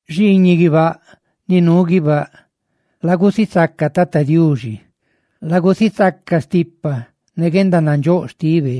Xiiñiꞌ guibáꞌ ni nuu guibáꞌ, lagusisaca Tata Diuxi; lagusisaca stipa ne guendanandxóꞌ xtibe,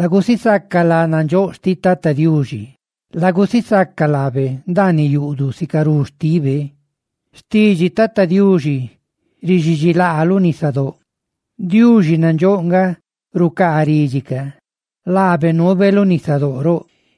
lagusisaca lá nandxóꞌ xtiꞌ Tata Diuxi, lagusisaca laabe ndaaniꞌ yuꞌduꞌ sicarú xtibe. Xtidxi Tata Diuxi rixidxilaa lu nisadóꞌ; Diuxi nandxóꞌ nga rucaa ridxi ca; ¡laabe nuube lu nisadóꞌ roꞌ!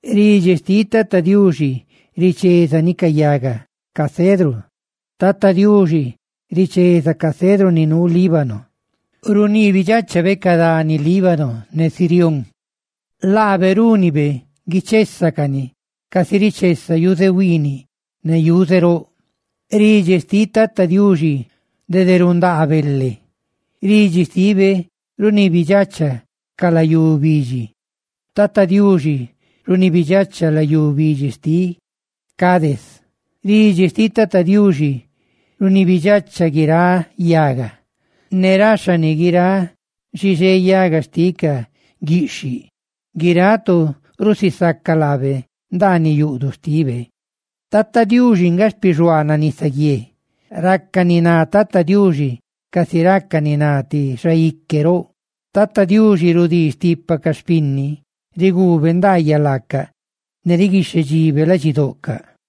ridxi xtiꞌ Tata Diuxi richézani ca yaga cedru. ¡Tata Diuxi richeza ca cedru ni nuu Líbano! Runiibi dxáchabe ca dani Líbano ne Sirión; ¡laabe rúnibe guichésacani casi richesa yuze huiiniꞌ ne yuze roꞌ! Ridxi xtiꞌ Tata Diuxi dede rundaa bele; ridxi xtibe runibidxacha ca layú bidxi; ¡Tata Diuxi runibidxacha layú bidxi xtiꞌ Cadés! Ridxi xtiꞌ Tata Diuxi runibidxacha guiráꞌ yaga, ne raxhani guiráꞌ xixé yaga xtiꞌ ca guiꞌxhiꞌ. Guiráꞌ tu rusisaca laabe, ndaaniꞌ yuꞌduꞌ xtibe. Tata Diuxi nga xpixuaanaꞌ nisaguié; ¡raca ni ná Tata Diuxi casi raca ni ná ti xaique roꞌ! Tata Diuxi rudii stipa ca xpinni; riguube ndaayaꞌ laaca ne riguixhedxibe ladxidoꞌcaꞌ.